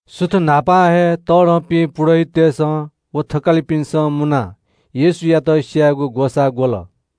सुथ न्‍हापां हे तःधंपिं पुजाहारीतय्‌सं व थकालिपिन्‍सं मुनाः येशूयात स्‍यायेगु ग्‍वसाः ग्‍वल।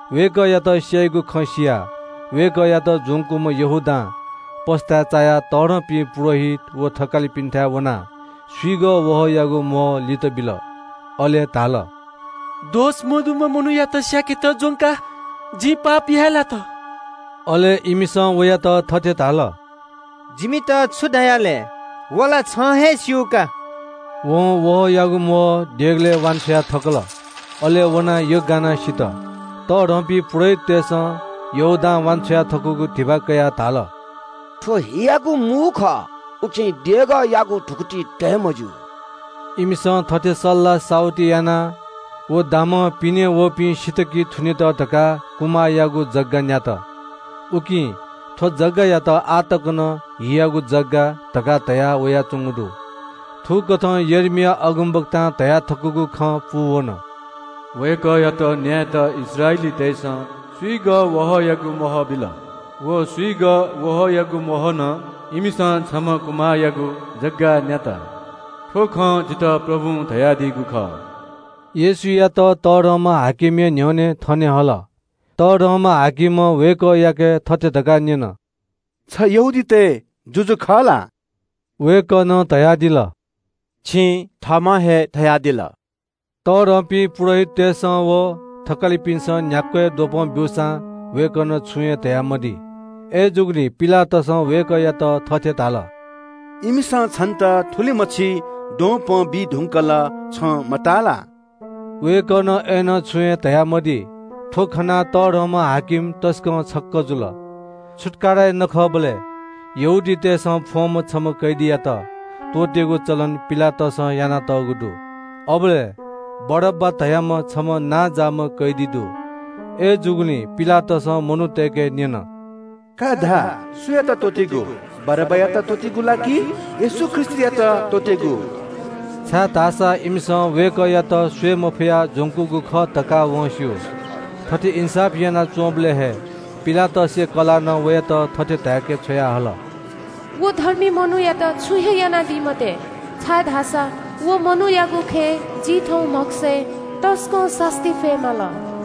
वय्‌कःयात स्‍याइगु खँ सियाः ज्‍वंकूम्‍ह यहूदां पस्‍ताय् चायाः तःधंपिं पुजाहारीत व थकालिपिन्‍थाय् वनाः स्‍विगः वहःयागु म्‍वहः लित बिल। अले धाल – “दोष मदुम्‍ह मनूयात स्‍याकेत ज्‍वंकाः जिं पाप याये लात।” अय्‌नं इमिसं वयात थथे धाल – “जिमित छु धया लय्? छं हे सीकि।” वं वहःयागु म्‍वहः देगलय् वान्‍छ्वया थकल। अले वनाः यग्‍गानाः सित। तःधंपिं पुजाहारीतय्‌सं यहूदां वान्‍छ्वया थकूगु धिबा कयाः धाल – “थ्‍व हियागु मू खः, उकिं देगःयागु धुकुतिइ तये मज्‍यू।” इमिसं थथे सल्‍लाह साहुति यानाः व दामं पिनें वःपिं सित कि थुनेत धकाः कुमाःयागु जग्‍गा न्‍यात। उकिं थ्‍व जग्‍गायात आः तक नं “हियागु जग्‍गा” धकाः धयावयाच्‍वंगु दु। थुकथं यर्मिया अगमवक्तां धयाथकूगु खँ पूवन – “वय्‌कःयात न्‍यायेत इस्राएलीतय्‌सं स्‍विगः वहःयागु म्‍वहः बिल। व स्‍विगः वहःयागु म्‍वहलं इमिसं छम्‍ह कुमाःयागु जग्‍गा न्‍यात। थ्‍व खँ जितः प्रभुं धयादीगु खः।” येशूयात बडा-हाकिमया न्‍ह्यःने थने हल। वं वय्‌कःयाके थथे धकाः न्‍यन – “छ यहूदीतय् जुजु खः ला?” वय्‌कलं धयादिल – “छिं थःम्‍हं हे धयादिल।” तःधंपिं पुजाहारीतय्‌सं व थकालिपिन्‍सं न्‍ह्याक्‍व हे द्वपं ब्‍यूसां वय्‌कलं छुं हे धयामदी। अय्‌जूगुलिं पिलातसं वय्‌कःयात थथे धाल – “इमिसं छन्‍त थुलिमछि द्वपं बी धुंकल छं मताः ला?” वय्‌कलं छुं हे धयामदी। थ्‍व खनाः तःधंम्‍ह हाकिम तसकं छक्‍क जुल। छुत्‍काराया नखःबलय् यहूदीतय्‌सं फ्‍वंम्‍ह छम्‍ह कैदीयात त्‍वःतेगु चलन पिलातसं यानातःगु दु। अबलय् बारब्‍बा धाःम्‍ह छम्‍ह कुख्‍यात कैदी दु। अय्‌जूगुलिं पिलातसं मनूतय्‌के न्‍यन – “का धा, सुयात त्‍वःतेगु? बारब्‍बायात त्‍वःतेगु ला कि येशू ख्रीष्‍टयात त्‍वःतेगु?” इमिसं वय्‌कःयात स्‍वये मफयाः ज्‍वंकूगु खः धकाः वं बांलाक स्‍यू। थथे इन्‍साफ यानाच्‍वंबलय् हे पिलातसया कलातं वयात थथे धाय्‌के छ्वयाहल – “व धर्मी मनूयात छुं हे यानादी मते, छाय्‌धाःसा व मनूयागु खँय् जिं थौं म्‍हगसय् तसकं सास्‍ती फये माल।”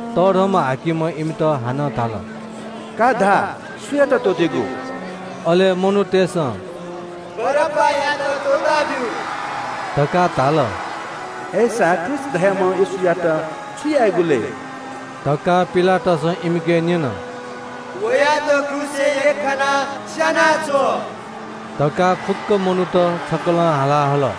बडा-हाकिमं इमित हानं धाल – “का धा, सुयात त्‍वःतेगु?” अले मनूतय्‌सं “बारब्‍बायात त्‍वःताब्‍यु” धकाः धाल। “अय्‌सा ख्रीष्‍ट धाःम्‍ह येशूयात छु यायेगु लय्?” धकाः पिलातसं इमिके न्‍यन। “वयात क्रूसय् यख्‍खानाः स्‍यानाछ्व” धकाः फुक्‍क मनूत छकलं हाला हल।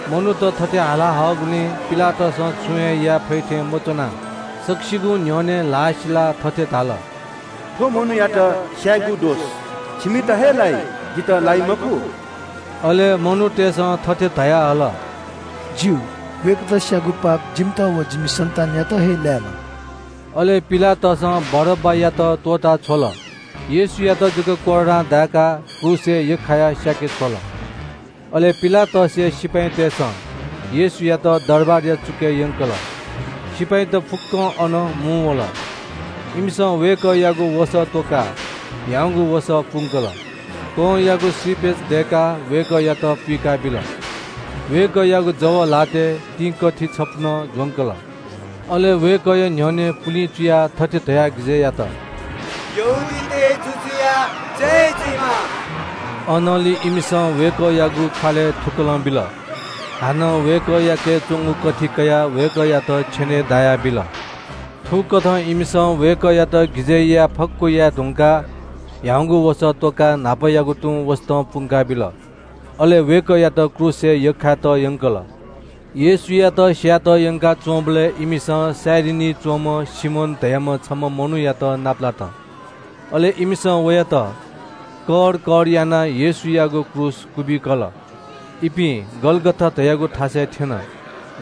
मनूत थथे हाला हःगुलिं पिलातसं छुं हे याये फइ थें मच्‍वनाः सकसिगुं न्‍ह्यःने ल्‍हाः सिलाः थथे धाल – “थ्‍व मनूयात स्‍याःगु दोष छिमित हे लाइ, जितः लाइ मखु।” अले मनूतय्‌सं थथे धयाहल – “ज्‍यू, वयात स्‍याःगु पाप जिमित व जिमि सन्‍तानयात हे लायेमा।” अले पिलातसं बारब्‍बायात त्‍वःता छ्वल। येशूयात धाःसा कोर्रां दाय्‌काः क्रूसय् यख्‍खाना स्‍याके छ्वल। अले पिलातसया सिपाइँतय्‌सं येशूयात दरबारया चुकय् यंकल। सिपाइँत फुक्‍कं अन मुंवल। इमिसं वय्‌कःयागु वसः त्‍वकाः ह्याउँगु वसः पुंकल। कंयागु श्रीपेच दय्‌काः वय्‌कःयात पुइकाबिल। वय्‌कःयागु जव ल्‍हातय् तिंकथि छपु नं ज्‍वंकल। अले वय्‌कःया न्‍ह्यःने पुलिं चुयाः थथे धयाः हाय्‌कल – “यहूदीतय् जुजुया जय जुइमा।” अनंलि इमिसं वय्‌कःयागु ख्‍वालय् थुकलं बिल। हानं वय्‌कःयाके च्‍वंगु कथि कयाः छेनय् दाया बिल। थुकथं इमिसं वय्‌कःयात गिजय् याये फक्‍व याये धुंकाः ह्याउँगु वसः त्‍वकाः न्‍हापायागु तुं वसतं पुंका बिल। अले वय्‌कःयात क्रूसय् यख्‍खायेत यंकल। येशूयात स्‍यायेत यंकाच्‍वंबलय् कुरेनी च्‍वंम्‍ह सिमोन धाःम्‍ह छम्‍ह मनूयात नापलात। अले इमिसं वयात कर कर यानाः येशूयागु क्रूस क्‍वबिकल। इपिं गलगथा धाःगु थासय् थ्‍यन।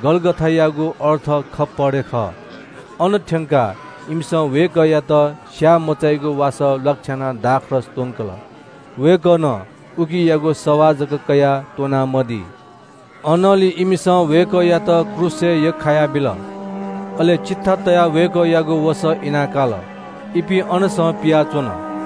गलगथायागु अर्थ खोपडी खः। अन थ्‍यंकाः इमिसं वय्‌कःयात स्‍याःमचाइगु वासः ल्‍वाकछ्यानाः दाखमद्य त्‍वंकल। वय्‌कलं उकियागु सवाः जक कयाः त्‍वना मदी। अनंलि इमिसं वय्‌कःयात क्रूसय् यख्‍खायाबिल। अले चिट्ठा तयाः वय्‌कःयागु वसः इना काल। इपिं अनसं पियाच्‍वन।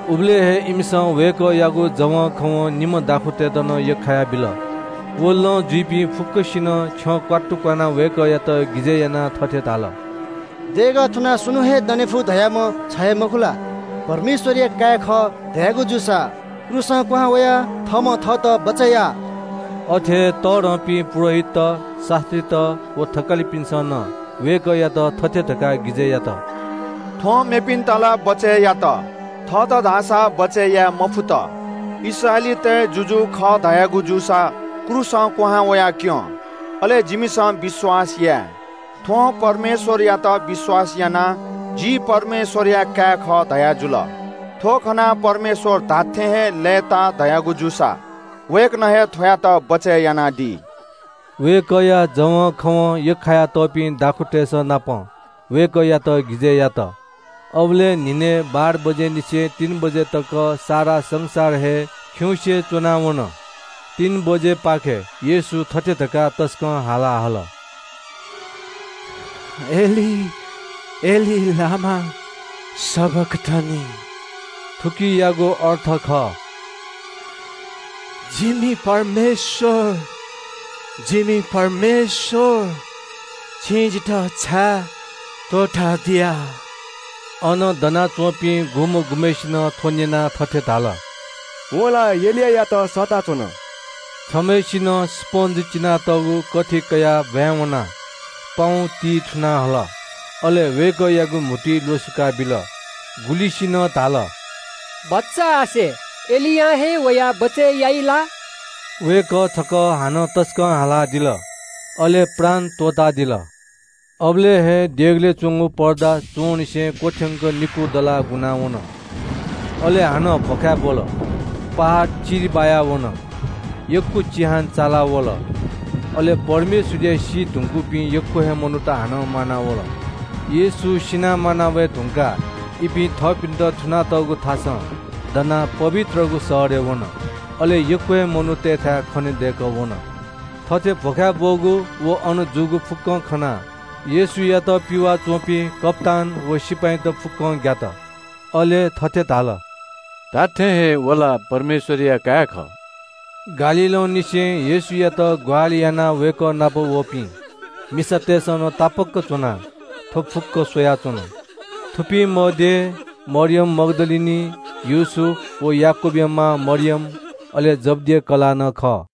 उबलय् हे इमिसं वय्‌कःयागु जवंखवं निम्‍ह दाखुँतय्‌त नं यख्‍खायाबिल। व लँ जुइपिं फुक्‍कसिनं छ्यं क्‍वात्तु क्‍वानाः वय्‌कःयात गिजय् यानाः थथे धाल – “देगः थुनाः स्‍वन्‍हुं हे दने फु धाःम्‍ह छ हे मखु ला? परमेश्‍वरया काय् खः धयागु जूसा क्रूसं क्‍वहां वयाः थःम्‍हं थःत बचय् या।” अथे हे तःधंपिं पुजाहारीत, शास्‍त्रीत व थकालिपिन्‍सं नं वय्‌कःयात थथे धकाः हाय्‌कल – “थ्‍वं मेपिन्‍त ला बचय् यात, थःत धाःसा बचय् याये मफुत। इस्राएलीतय् जुजु खः धयागु जूसा क्रूसं क्‍वहां वयाक्‍यँ। अले जिमिसं विश्‍वास याये। थ्‍वं परमेश्‍वरयात विश्‍वास यानाः – ‘जि परमेश्‍वरया काय् खः’ धयाजुल। थ्‍व खनाः परमेश्‍वर धात्‍थें हे लय्‌ताः धयागु जूसा वय्‌कलं हे थ्‍वयात बचय् यानादी।” वय्‌कःया जवंखवं यख्‍खाया तःपिं दाखुँतय्‌संनापं वय्‌कःयात हाय्‌कल। अबलय् न्‍हिनय् बाह्र बजेनिसें तीन बजे तक सारा देश हे खिउँसे च्‍वना वन। तीन बजेपाखे येशू थथे धकाः तसकं हाला हल – “इलोई-इलोई लामा सबखथनी।” थुकियागु अर्थ खः – “जिमि परमेश्‍वर, जिमि परमेश्‍वर, छिं जितः छाय् त्‍वःतादिया?” अन दनाच्‍वंपिं गुम्‍ह गुम्‍हय्‌सिनं थ्‍व न्‍यनाः थथे धाल – “वं ला एलियायात सःता च्‍वन।” छम्‍हय्‌सिनं स्‍पन्‍ज चिनातःगु कथि कयाः ब्‍वाँय् वनाः पाउँतिइ थुनाः हल, अले वय्‌कःयागु म्‍हुतुइ ल्‍वसुकाबिल। गुलिसिनं धाल – “भचा आसे, एलियां हे वयाः बचय् याइ ला?” वय्‌कः छकः हानं तसकं हालादिल, अले प्राण त्‍वःतादिल। अबलय् हे देगलय् च्‍वंगु पर्दा च्‍वंनिसें क्‍वथ्‍यंक निकू दलाः गुना वन। अले हानं भ्‍वखाय् ब्‍वल। पहाड चिरि बायावन। चिहान चाला वल। अले सी धुंकूपिं यक्‍व हे विश्‍वासीत हानं म्‍वानावल। येशू सिनाः म्‍वाना वये धुंकाः इपिं थःपिन्‍त थुनातःगु थासं दनाः पवित्रगु शहरय् वन। अले यक्‍व हे मनूतय्‌थाय् खनेदय्‌कः वन। थथे भ्‍वखाय् ब्‍वःगु व अन जूगु फुक्‍कं खनाः येशूयात पिवाः च्‍वंपिं कप्‍तान व सिपाइँत फुक्‍कं ग्‍यात। अले थथे धाल – “धात्‍थें हे व ला परमेश्‍वरया काय् खः।” गालीलंनिसें येशूयात ग्‍वाहालि यानाः वय्‌कः नाप वःपिं मिसातय्‌सं नं तापाक्‍क च्‍वनाः थ्‍व फुक्‍क स्‍वयाच्‍वन। थुपिं मध्‍ये मरियम मग्‍दलिनी, याकूब व योसेफया मां मरियम, अले जब्‍दिया काय्‌पिनि मां खः।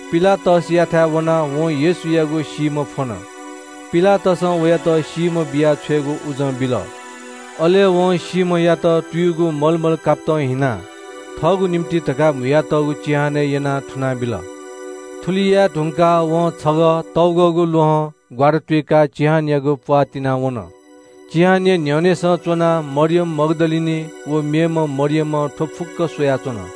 पिलातसयाथाय् वनाः वं येशूयागु सीम्‍ह फ्‍वन। पिलातसं वयात सीम्‍ह बिया छ्वयेगु उजं बिल। अले योसेफं सीम्‍हयात भिंगु सुति कापतं हिनाः थःगु निंतिं धकाः म्‍हुयातःगु चिहानय् यनाः अन तयाबिल। थुलि याये धुंकाः वं छगः तग्‍वःगु ल्‍वहं ग्‍वारातुइकाः चिहानयागु प्‍वाः तिनाः अनं वन। चिहानया न्‍ह्यःनेसं च्‍वनाः मरियम मग्‍दलिनी व मेम्‍ह मरियमं थ्‍व फुक्‍क स्‍वयाच्‍वन।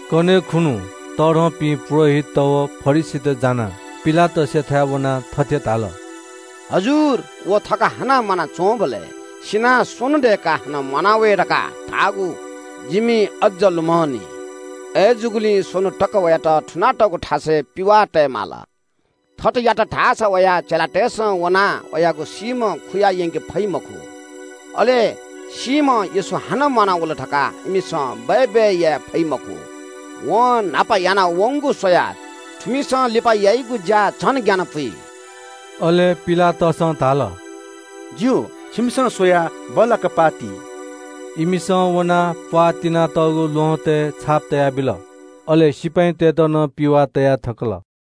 कन्‍हय् खुन्‍हु, विश्रामबार खुन्‍हु तःधंपिं पुजाहारीत व फरिसीत जानाः पिलातसयाथाय् वनाः थथे धाल – “हजुर, व ध्‍वंलाइम्‍हं म्‍वानाच्‍वंबलय् – ‘सिनाः स्‍वन्‍हु दय्‌काः हानं म्‍वाना वये’ धकाः धाःगु जिमि अज्‍ज लुमंनि। अय्‌जूगुलिं स्‍वन्‍हु तक वयात थुनातःगु थासय् पिवाः तये माल। थथे यात धाःसा वया चेलातय्‌सं वनाः वयागु सीम्‍ह खुयायंके फइ मखु। अले सीम्‍ह येशू हानं म्‍वानावल धकाः इमिसं बय्‌बय् याये फइ मखु। वं न्‍हापा याना वंगु स्‍वयाः थुमिसं लिपा याइगु ज्‍या झन ग्‍यानपुइ।” अले पिलातसं धाल – “ज्‍यू, छिमिसं स्‍वयाः बल्‍लाक पाः ति।” इमिसं वनाः प्‍वाः तिनातःगु ल्‍वहँतय् छाप तयाबिल। अले सिपाइँतय्‌त नं पिवाः तया थकल।